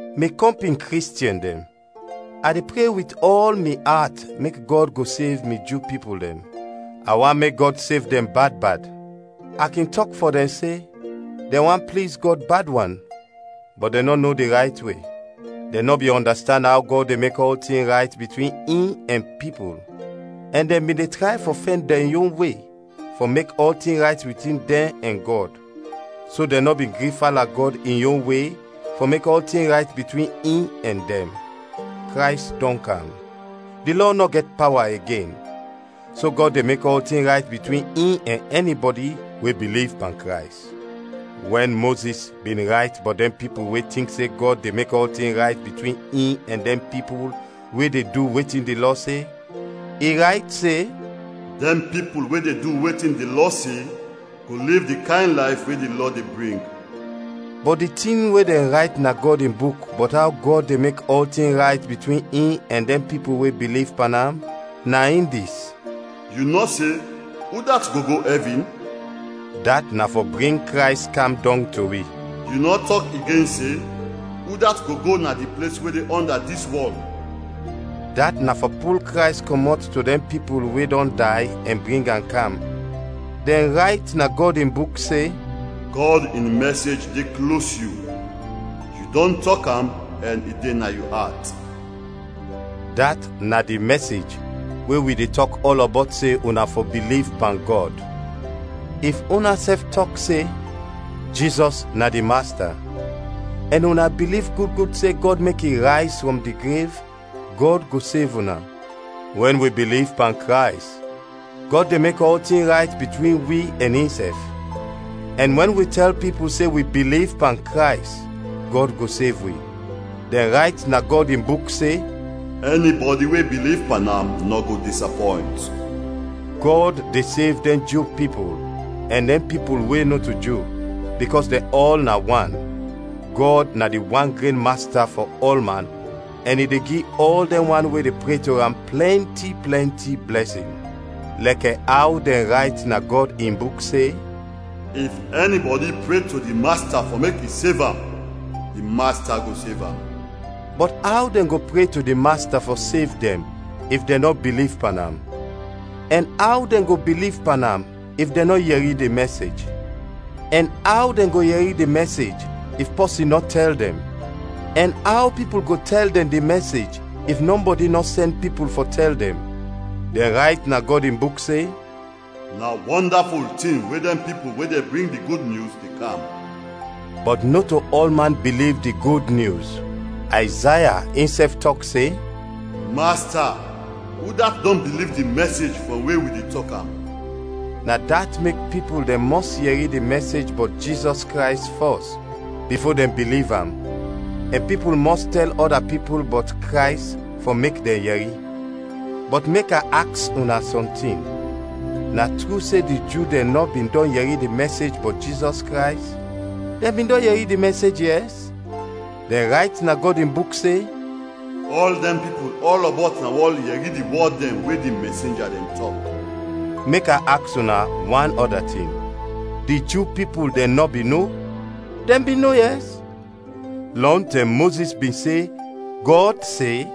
Mi kɔmpin Kristiɛn dɛn, a de pre wit ɔl mi at mek Gɔd go sev mi Ju pipul dɛn. A want mek Gɔd sev dɛn bad bad. A kin tɔk fɔ dɛn se, dɛn want pliz Gɔd bad wan, bɔt dɛn nɔ no di rayt we. Dɛn nɔ bin ɔndastand aw Gɔd de mek ɔltin rayt bitwin in ɛn pipul, ɛn dɛn bin de tray fɔ fɛn dɛn yon we fɔ mek ɔltin rayt bitwin dɛn ɛn Gɔd; so dɛn nɔ bin gri fala Gɔd in yon we fɔ mek ɔltin rayt bitwin in ɛn dɛn. Krays dɔn kam, di Lɔ nɔ gɛt pawa igen, so Gɔd de mek ɔltin rayt bitwin in ɛn ɛnibɔdi we biliv pan Krays. Wɛn Mozis bin rayt bɔt dɛn pipul we tink se Gɔd de mek ɔltin rayt bitwin in ɛn dɛn pipul we de du wetin di Lɔ se, i rayt se: “Dɛn pipul we de du wetin di Lɔ se, go liv di kayn layf we di Lɔ de bring.” Bɔt di tin we dɛn rayt na Gɔd in Buk bɔt aw Gɔd de mek ɔltin rayt bitwin in ɛn dɛn pipul we biliv pan am, na in dis: “Yu nɔ se, udat go go ɛvin?” (dat na fɔ bring Krays kam dɔng to wi). “Yu nɔ tɔk igen se, udat go go na di ples we de ɔnda dis wɔl?” (dat na fɔ pul Krays kɔmɔt to dɛn pipul we dɔn day ɛn bring am kam.) Dɛn rayt na Gɔd in Buk se: “Gɔd in mɛsej de klos yu, yu dɔn tɔk am ɛn i de na yu at,” dat na di mɛsej we wi de tɔk ɔlɔbɔt se una fɔ biliv pan Gɔd. If unasɛf tɔk se, “Jizɔs na di Masta,” ɛn una biliv gud gud se Gɔd mek i rayz frɔm di grev, Gɔd go sev una. Wɛn wi biliv pan Krays, Gɔd de mek ɔltin rayt bitwin wi ɛn insɛf; ɛn wɛn wi tɛl pipul se wi biliv pan Krays, Gɔd go sev wi. Dɛn rayt na Gɔd in Buk se, “Ɛnibɔdi we biliv pan am nɔ go disapɔynt.” Gɔd de sev dɛn Ju pipul ɛn dɛn pipul we nɔto Ju, bikɔs dɛn ɔl na wan, Gɔd na di wan gren Masta fɔ ɔlman ɛn i de gi ɔl dɛn wan we de pre to am plɛnti plɛnti blɛsin. Lɛkɛ aw dɛn rayt na Gɔd in Buk se, “If ɛnibɔdi pre to di Masta fɔ mek i sev am, di Masta go sev am.” Bɔt aw dɛn go pre to di Masta fɔ sev dɛn if dɛn nɔ biliv pan am? Ɛn aw dɛn go biliv pan am if dɛn nɔ yɛri di mɛsej? Ɛn aw dɛn go yɛri di mɛsej if pɔsin nɔ tɛl dɛn? Ɛn aw pipul go tɛl dɛn di mɛsej if nɔbɔdi nɔ sɛn pipul fɔ tɛl dɛn? Dɛn rayt na Gɔd in Buk se, “Na wɔndaful tin we dɛn pipul we de bring di Gud Nyus, de kam.” Bɔt nɔto ɔlman biliv di Gud Nyus. Ayzaya insɛf tɔk se, “Masta, udat dɔn biliv di mɛsej frɔm we wi de tɔk am?” Na dat mek pipul dɛn mɔs yɛri di mɛsej bɔt Jizɔs Krays fɔs, bifo dɛn biliv am, ɛn pipul mɔs tɛl ɔda pipul bɔt Krays fɔ mek dɛn yɛri. Bɔt mek a aks una sɔntin: Na tru se di Ju dɛn nɔ bin dɔn yɛri di mɛsej bɔt Jizɔs Krays? Dɛn bin dɔn yɛri di mɛsej, yɛs. Dɛn rayt na Gɔd in Buk se: “Ɔl dɛn pipul ɔlɔbɔt na wɔl yɛri di wɔd dɛn we di mɛsenja dɛn tɔk.” Mek a aks una wan ɔda tin: Di Ju pipul dɛn nɔ bin no? Dɛn bin no, yɛs. Lɔntɛm Mozis bin se, Gɔd se: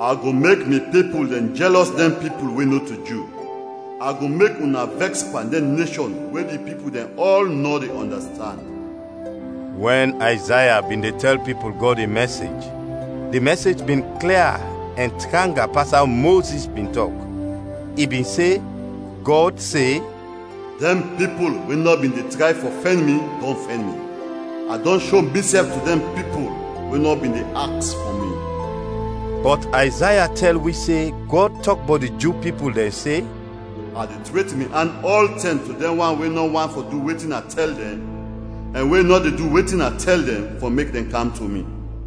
“A go mek mi pipul dɛn jɛlɔs dɛn pipul we nɔto Ju; a go mek una vɛks pan dɛn neshɔn we di pipul dɛn ɔl nɔ de ɔndastand.” Wɛn Ayzaya bin de tɛl pipul Gɔd in mɛsej, di mɛsej bin klia ɛn tranga pas aw Mozis bin tɔk; i bin se, Gɔd se: “Dɛn pipul we nɔ bin de tray fɔ fɛn mi dɔn fɛn mi, a dɔn sho misɛf to dɛn pipul we nɔ bin de aks fɔ mi.” Bɔt Ayzaya tɛl wi se Gɔd tɔk bɔt di Ju pipul dɛn se, “A de tret mi an ɔltɛm to dɛn wan we nɔ want fɔ du wetin a tɛl dɛn ɛn we nɔ de du wetin a tɛl dɛn, fɔ mek dɛn kam to mi.”